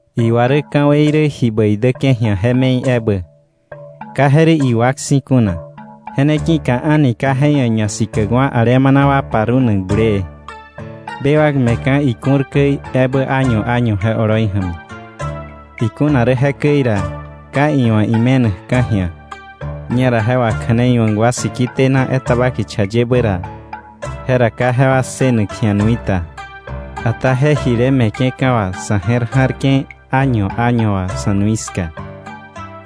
Iwa rä ka̱wei rä ji bäi däke̱ ji̱a je me̱i ebä, ka je rä iwak si̱ kuna. Je ne ki̱ka a̱ni ka je ia̱ ñasikäkwa̱ alemana wa parunak bulee, bewak me̱ka̱ iku̱r käi ebä año año je oloi ja̱mi. Ikuna rä jekäi ra, ka iwa̱ ime̱nakka̱ ji̱a, ñera je wakja̱neiwa̱k wa siki tena etaba kicha yebä ra, jera ka jewa ssënak ji̱a nui ta. Ata je jile me̱ke̱ka̱ wà sa̱ je̱r ja̱rke̱ año año wà sa̱ nui ska.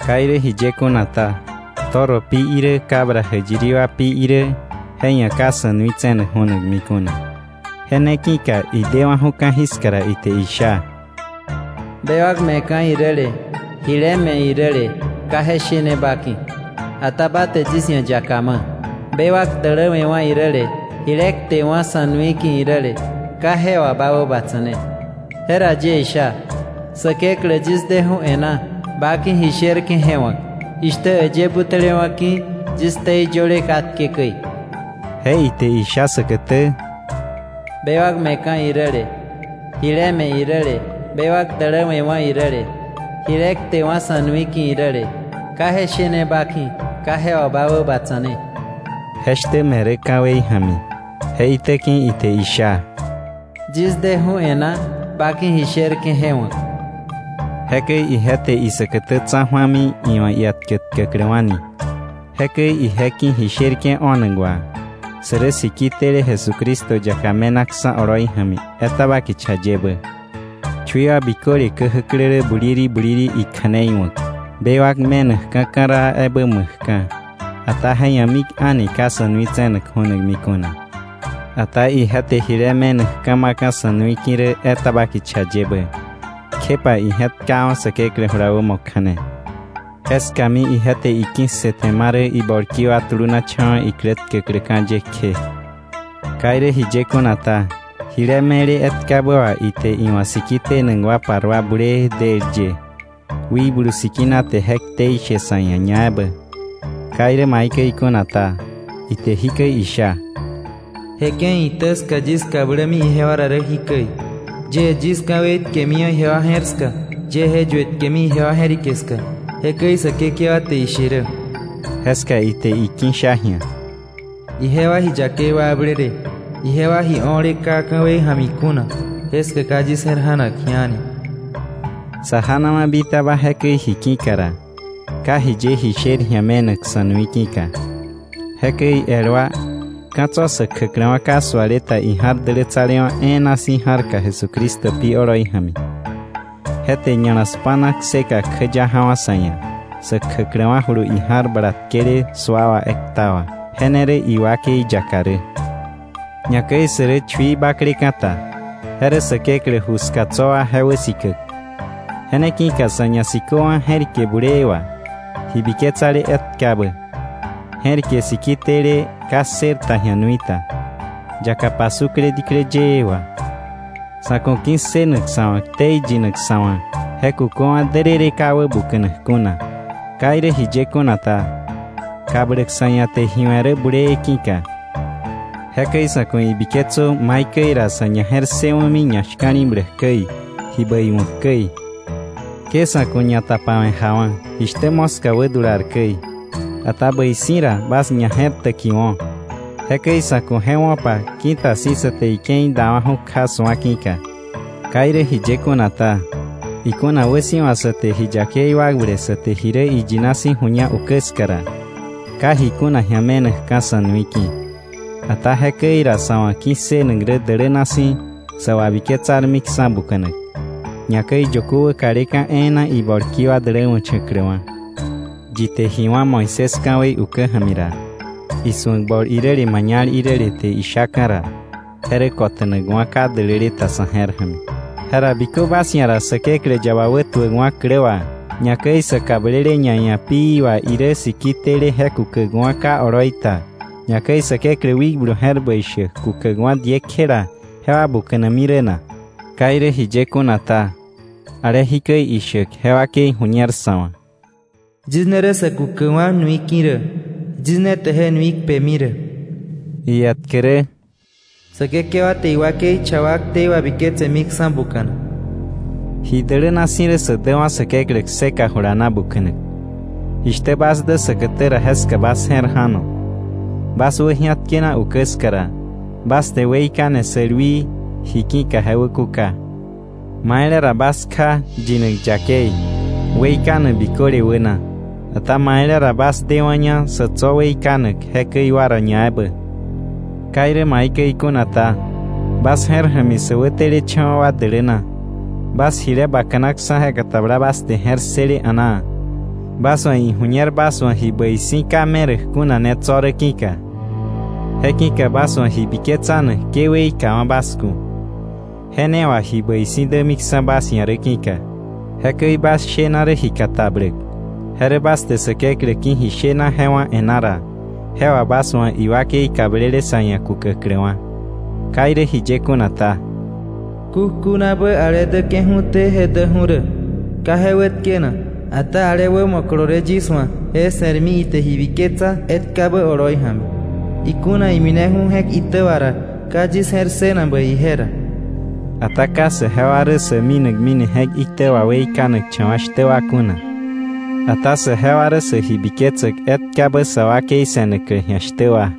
Ka irä jiye kuna ta, toro pi irä cabra jäyiri wa pi irä, je ia̱ ka sa̱ nui tse̱nak ju̱nami kuna. Je ne ki̱ka idewa̱ju̱ ka̱jiska ra, ite isha: “Bewak me̱ka̱ iräle jile me̱ iräle ka je shene ba ki̱, ata ba te yis ia̱ yaka ma̱. Bewak däläwe̱wa̱ iräle, jile ktewa̱ sa̱ nui ki̱ iräle, ka je wà ba wäbatsa̱ne. Jera yie isha: ‘Säkeklä, yis deju̱ e̱ná ba ki̱ ji sherke̱ je wa̱k, jishtä äyë butälewa̱ ki̱ yis ktei yöle katke käi.’” Je ite isha säkätä: “Bewak me̱ka̱ iräle, jile me̱ iräle, bewak däläwe̱wa̱ iräle, jile kte wa̱ sa̱ nui ki̱ iräle, ka je shene ba ki̱, ka je wà bä wäbatsane.” Jeshtä me̱ rä ka̱wei ja̱mi. Je itäki̱ ite isha: “Yis deju̱ e̱ná ba ki̱ ji sherke̱ je wa̱k.” Jekäi ije te isäkätä tsa̱ju̱ami iwa̱ ietkä tkäkläwa̱ni. Jekäi ije ki̱ ji sherke̱ o̱nak wà, sä rä siki tele Jesucristo yaka me̱naksa̱ oloi ja̱mi etaba kicha yebä. Chui wa biköle käjäklä rä buliri buliri ikja̱nei wa̱k, bewak me̱nakka̱ ka̱raa ebä ma̱kka̱, ata je ia̱ mik a̱ni ka sa̱ nui tse̱nak ju̱nami kuna. Ata ije te jile me̱nakka̱ ma̱ka̱ sa̱ nui ki̱ rä etaba kicha yebä, kjepa ije̱tkawa̱ Säkeklä jula wämo kja̱ne. Jeskami ije te iki̱ssëte ma rä ibolki wa tulunacha̱wa̱ iklä tkäkläka̱ ye kje. Ka irä jiye kuna ta, jile me̱le etkabä wà, ite iwa̱ siki tenak wa parua bulee, del ye. Wikblu Sikina te je ktei she sa̱ ia̱ ñaebä. Ka irä maikäi kuna ta, ite jikäi isha: “Je ke̱i itä ska yis kablämi ijewa ra jikäi: Yie yis ka̱wei tkemiwa̱ ijewa je̱r ska, yie je yuetkemi ijewa je̱rike ska, jekäi Säkekewa te ishe rä.” Jeska ite iki̱sha ji̱a: “Ijewa ji yakei wakblele, ijewa ji o̱le ka ka̱wei ja̱mi kuna, jeska ka yis je̱r ja̱nak ji̱a a̱ni.” Sa janawa̱ bitaba jekäi ji ki̱ka ra, ka jiye ji sher ji̱a me̱nak sa̱ nui ki̱ka. Jekäi el wa, ka̱ tso̱ sä kjäkläwa̱ ka suale ta ija̱r Dälätsalewa̱ E̱e̱na Si̱ ja̱rka Jesucristo pi oloi ja̱mi. Je te ña̱la spa̱na kseka kjäya ja̱wa̱ sa̱ ia̱, sä kjäkläwa̱julu ija̱r bala tkele sua wà ekta wà. Je ne rä iwakei yaka rä. Ñakäi sä rä chui bakleka̱ ta, je rä Säkeklä ju ska tso̱ wa je wäsikäk. Je ne ki̱ka sa̱ ñasiköwa̱ je̱rike bulee wà, ji biketsale etkabä, je̱rike siki tele ka ssër ta ji̱a nui ta, yaka pasukle diklä yëë wà. Sa̱ ku̱ ki̱ssënak sa̱ wa̱ ktei yinak sa̱ wa̱ je kuköwa̱ därërë ka wäbuka̱nak kuna. Ka irä jiye kuna ta, kabläk sa̱ ia̱ te ji we̱ rä bulee ki̱ka. Jekäi sa̱ ku̱ ibiketsö maikäi ra sa̱ ñaje̱rssëwa̱mi ñashka̱li̱bläk käi, ji bäi wa̱k käi. Ke sa̱ ku̱ ñatapawe̱ jawa̱, jishtä moska wädular käi, ata bäi si̱ ra bas ñaje̱rtäkiwo̱. Jekäi sa̱ ku̱ je wo̱pa ki̱ta si̱ sa te ike̱i dawa̱ju̱ kja su̱a ki̱ka. Ka irä jiye kuna ta, ikuna wäsi̱wa sa te ji yakei wakble sa te ji rä iyina ju̱ña ukä ska ra, ka ji kuna ji̱a me̱nakka̱ sa̱ nui ki̱. Ata jekäi ra sa̱ wa̱ ki̱ssënak rä däläna si̱, sa wabiketsarmiksa̱ buka̱nak, ñakäi yökö wäkaleka̱ e̱e̱na ibolki wa däläwa̱cha̱kläwa̱. Yi te ji wá̱ Moisés ka̱wei ukä ja̱mi ra, isu̱ak bol iräle mañal iräle te ishaka̱ ra, je rä kota̱nakwa̱ ka däläle ta sa̱ je̱r ja̱mi. Jera ¿bikö bas ia̱ ra Säkeklä yaba wätuäkwa̱ klä wà, ñakäi sä kablele ñaia̱ pií wà, irä siki tele je kukäkwa̱ ka oloi ta, ñakäi Säkeklä wikblu je̱r bäi shäk kukäkwa̱ diekjela, jewa buka̱nami rä na? Ka irä jiye kuna ta, ale jikäi ishäk je wakei ju̱ñer sa̱ wa̱: “Yis ne rä sä kukäkwa̱ nui ki̱ rä. Yis ne te je nui kpemi rä.” Ietkä rä: “Säkekewa te iwakei cha wa ktei wabiketsemiksa̱ buka̱nak.” ¡Ji däläna si̱ rä sä däwa̱ Säkeklä kseka jula na buka̱nak! Jishtä bas dä säkätä ra jeska bas je̱r ja̱no. Bas wäji̱atkena ukä ska ra, bas te weikane sälwii ji ki̱ je wäkuka. Maile ra bas kja yinak yakei, weikanak biköle wäna, ata maile ra bas dewa̱ña sa̱ tso̱ weikanak jekäi wa ra ñaebä. Ka irä maikäi kuna ta, bas je̱r ja̱mi sä wätelecha̱wa̱ wa däläna, bas jile bakanaksa̱ je katabla bas te je̱r ssële a̱naa. Bas wa̱ iju̱ñer bas wa̱ ji bäi si̱ ka meräk kuna ne tso̱ rä ki̱ka. Je ki̱ka bas wa̱ biketsanak ke weikawa̱ bas ku̱, je ne wà ji bäi si̱ dämiksa̱ bas ia̱ rä ki̱ka. Jekäi bas shena rä ji katabläk, je rä bas te Säkeklä ki̱ ji shena je wá̱ e̱ná ra, je wà bas wa̱ iwakei kablele sa̱ ia̱ kukäkläwa̱. Ka irä jiye kuna ta, “Kukjunabä ale däke̱ju̱té je däju̱ rä, ka je wätkenak. ata ale wämo kolole yis wa̱, je se̱rmi ite ji biketsa etkabä oloi ja̱mi; ikuna imineju̱ni je̱k itä wà ra, ka yis je̱r ssënak bäi ije ra.” Ata ka saje wa rä sä minakmini je̱k itä wà weikanakcha̱wa̱ shtä wa kuna, ata saje wa rä sä ji biketsäk etkabä sa wakei se̱naklä ji̱a shtä wa.